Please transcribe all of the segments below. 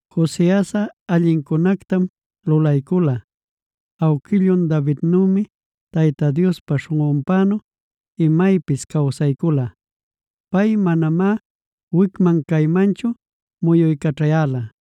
Josiasꞌa allincunätam lulaycula; awquillun Davidnümi Tayta Diospa śhunꞌunpänu imaypis cawsaycula. Pay manamá wicman-caymanchu muyuycaćhayäla.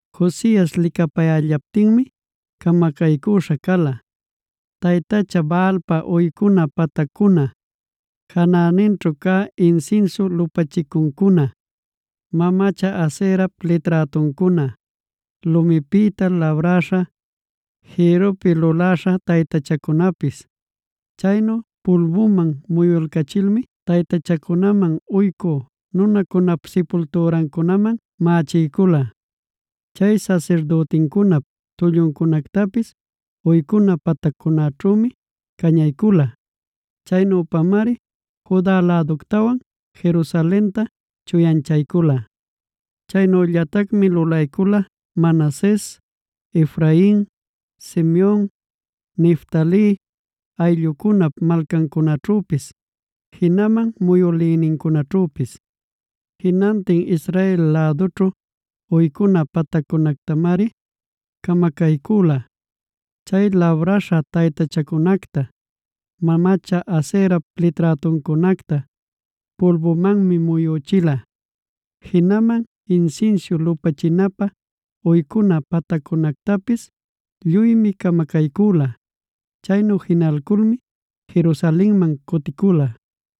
Josias licapayällaptinmi camacaycüśha cala: taytacha Baalpab uycuna patacnincuna, janäninćhu cä insinsiu lupachicuncuna, mamacha Aserap liträtuncuna, lumipïta labräśha jïrrupi luläśha taytachacunapis. Chaynu pulbuman muyulcachilmi taytachacunaman uycü nunacunap sipultürancunaman mächiycüla. Chay sasirdütincunap tulluncunactapis uycuna pataccunaćhümi cañaycüla.c Chaynüpamari Juda läductawan Jerusalenta chuyanchaycula. Chaynüllatacmi lulaycula Manases, Efrain, Simeon, Neftali ayllucunap malcancunaćhüpis, jinaman muyülïnincunaćhüpis. Jinantin Israel lädućhu uycuna pataccunactamari camacaycüla. Chay labräśha taytachacunacta, mamacha Aserap liträtuncunacta pulbumanmi muyüchila. Jinaman insinsiu lupachinapä uycuna pataccunactapis lluymi camacaycüla. Chaynu jinalculmi Jerusalenman cuticula.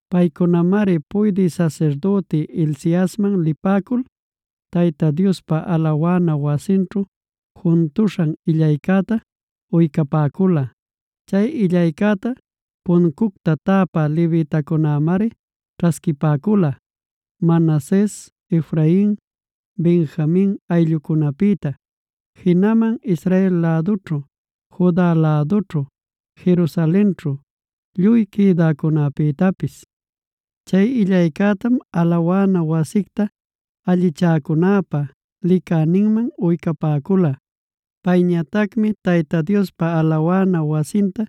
Paycunamari puydï sasirdüti Hilciasman lipäcul, Tayta Diospa alawana wasinćhu juntuśhan illaycäta uycapäcula. Chay illaycäta puncucta täpä levitacunämari ćhasquipäcula Manases, Efrain, Benjamin ayllucunapïta, jinaman Israel lädućhu, Juda lädućhu, Jerusalenćhu lluy quïdäcunäpïtapis. Chay illaycätam alawana wasicta allichäcunäpa licäninman uycapäcula. Payñatacmi Tayta Diospa alawana wasinta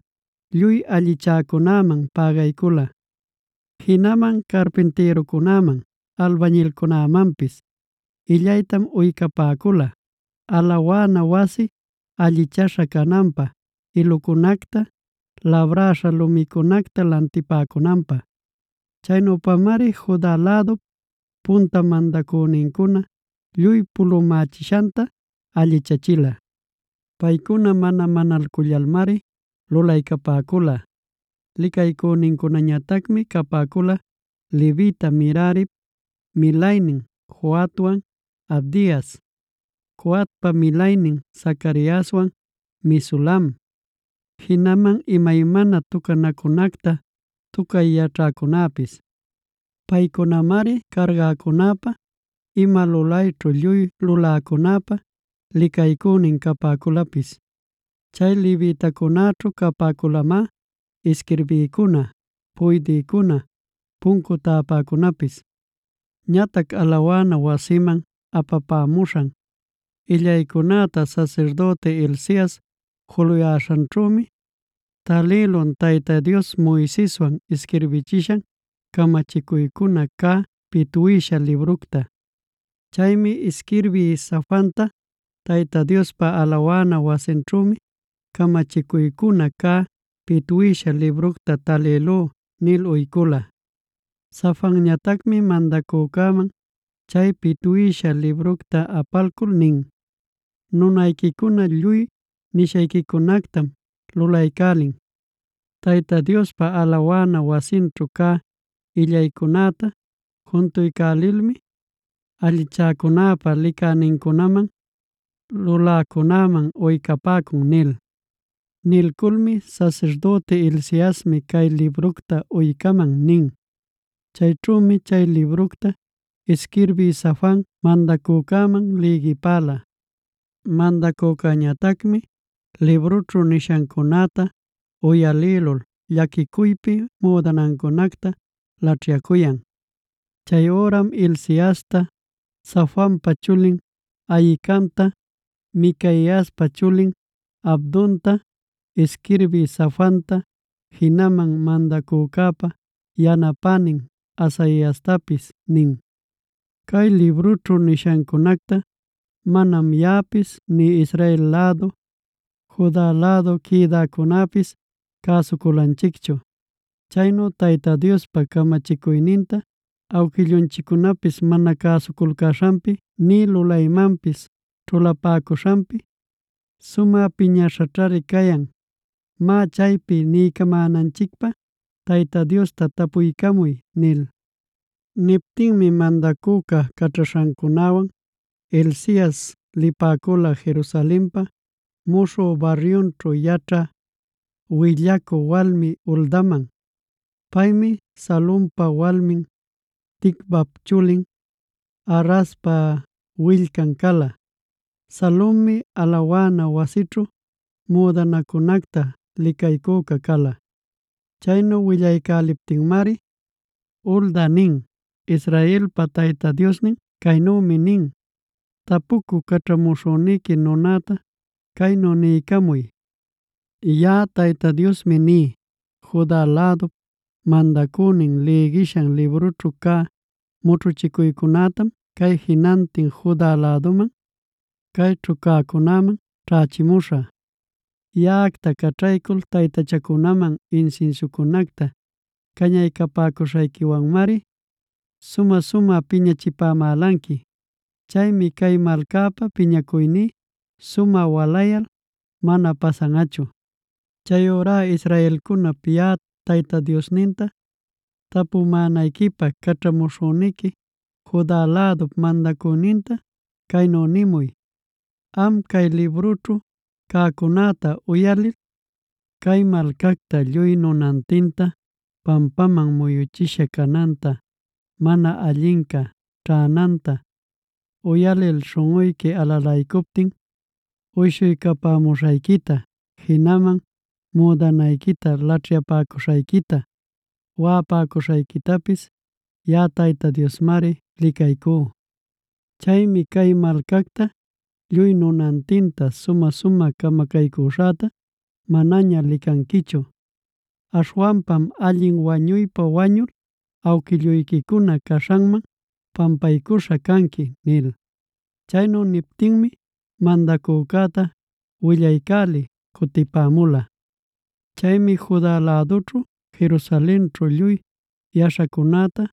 lluy allichäcunäman pägaycula. Jinaman carpintïrucunäman, albañilcunämanpis illaytam uycapäcula, alawana wasi allichaśha cananpä ilucunacta, labräśha lumicunacta lantipämunanpä. Chaynüpamari Juda lädup punta mandacünincuna lluy pulumächishanta allichachila. Paycuna mana manalcullalmari lulaycapäcula. Licaycünincunañatacmi capäcula levita Merarip milaynin Jahatwan Abdias, Coatpa milaynin Zacariaswan Mesulam, jinaman imaymana tucanacunacta tucay yaćhäcunäpis. Paycunamari cargäcunäpa, ima lulayćhu lluy luläcunäpa licaycünin capäculapis. Chay levitacunäćhu capäculamá isquirbïcuna, puydïcuna, puncu täpäcunapis. Ñatac alawana wasiman apapämuśhan illaycunäta sasirdüti Hilcias juluyäśhanćhümi, talïlun Tayta Dios Moiseswan isquirbichishan camachicuycuna cä pitwïsha libructa. Chaymi isquirbï Safanta: “Tayta Diospa alawana wasinćhümi camachicuycuna cä pitwïsha libructa talïlú” nil uycula. Safanñatacmi mandacücäman chay pitwïsha libructa apalcul nin: “Nunayquicuna lluy nishayquicunactam lulaycälin. Tayta Diospa alawana wasinćhu cä illaycunäta juntuycälilmi allichäcunäpa licänincunaman, luläcunäman uycapäcun” nil. Nilculmi: “Sasirdüti Hilciasmi cay libructa uycäman” nin. Chayćhümi chay libructa isquirbï Safan mandacücäman lïgipäla. Mandacücäñatacmi librućhu nishancunäta uyalïlul llaquicuypi müdanancunacta laćhyacuyan. Chay üram Hilciasta, Safanpa chulin Ahicamta, Micaiaspa chulin Abdonta, isquirbï Safanta, jinaman mandacücäpa yanapänin Asaiastapis nin: “Cay librućhu nishancunacta manam yaꞌapis, nï Israel lädu, Juda lädu quïdäcunäpis cäsuculanchicchu. Chaynu Tayta Diospa camachicuyninta awquillunchiccunapis mana cäsuculcäśhanpi nï lulaymanpis ćhulapäcuśhanpi sumä piñäśhaćhari cayan. Má, chaypi niycamänanchicpä Tayta Diosta tapuycamuy” nil. Niptinmi mandacüca caćhaśhancunäwan Hilcias lipäcula Jerusalenpa muśhü baryunćhud yaćhä willacü walmi Huldaman. Paymi Salumpa walmin, Ticvap chulin, Harhaspa willcan cala. Salummi alawana wasićhu müdanacunacta licaycüca cala. Chaynu willaycäliptinmari, Hulda nin: “Israelpa Tayta Diosnin caynümi nin. Tapucü caćhamuśhüniqui nunäta caynu niycamuy: ‘Yaꞌa Tayta Diosmi ní: Juda lädup mandacünin lïgishan librućhu cä mućhuchicuycunätam cay jinantin Juda läduman, cayćhu cäcunäman ćhächimuśhä. Yaꞌacta caćhaycul taytachacunaman insinsiucunacta cañaycapäcuśhayquiwanmari sumä-sumä piñachipäcamalanqui. Chaymi cay malcäpä piñacuyní sumä walayal mana pasanꞌachu. “ ‘Chayurá israelcunap yaꞌa Tayta Diosninta tapumänayquipä caćhamuśhüniqui Juda lädup mandacüninta caynu nimuy: “Am, cay librućhu cäcunäta uyalil, cay malcacta lluy nunantinta pampaman muyuchisha cananta mana allinca ćhänanta uyalil śhunꞌuyqui alalaycuptin uyshuycapämuśhayquita, jinaman müdanayquita laćhyapäcuśhayquita, waꞌapacuśhayquitapis yaꞌa Tayta Diosmari licaycú. Chaymi cay malcacta lluy nunantinta sumä-sumä camacaycuśhäta manaña licanquichu. Aśhwanpam allin wañuypa wañul awquilluyquicuna caśhanman pampaycuśha canqui”’” nil. Chaynu niptinmi mandacücäta willaycälï cutipämula. Chaymi Juda lädućhu, Jerusalenćhu lluy yaśhacunäta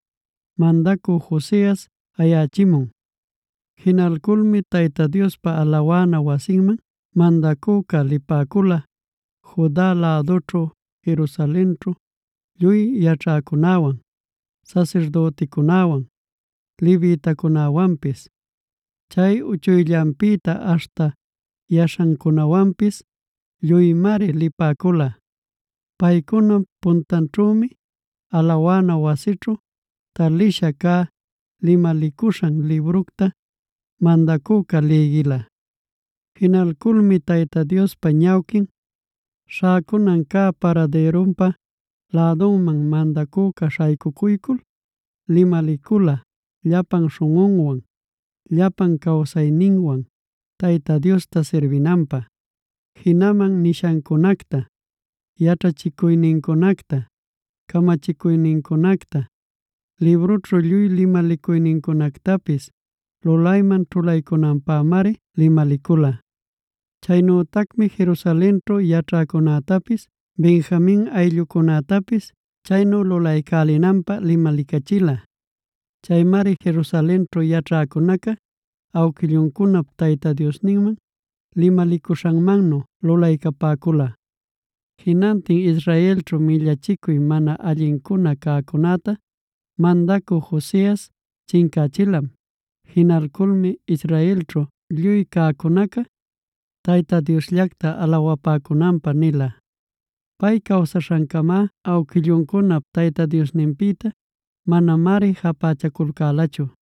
mandacü Josias ayächimun. Jinalculmi Tayta Diospa alawana wasinman mandacüca lipäcula Juda lädućhu Jerusalenćhu lluy yaćhäcunäwan, sasirdüticunäwan, levitacunäwanpis; chay uchuyllanpïta aśhta yaśhancunawanpis lluymari lipäcula. Paycunap puntanćhümi alawana wasićhu talisha cä limalicuśhan libructa mandacüca lïgila. Jinalculmi Tayta Diospa ñawquin śhäcunan cä paradïrunpa lädunman mandacüca śhaycucuycul limalicula llapan śhunꞌunwan, llapan cawsayninwan Tayta Diosta sirbinanpä. Jinaman nishancunacta, yaćhachicuynincunacta, camachicuynincunacta, librućhu lluy limalicuynincunactapis lulayman ćhulaycunanpämari limalicula. Chaynütacmi Jerusalenćhu yaćhäcunätapis Benjamin ayllucunätapis chaynu lulaycälinanpä limalicachila. Chaymari Jerusalenćhu yaćhäcunaca awquilluncunap Tayta Diosninman limalicuśhanmannu lulaycapäcula. Jinantin Israelćhu millachicuy mana allincuna cäcunäta mandacü Josias chincächilam. Jinalculmi Israelćhu lluy cäcunaca Tayta Diosllacta alawapäcunanpä nila. Pay cawsaśhancama awquilluncunap Tayta Diosninpïta manamari japächaculcälachu.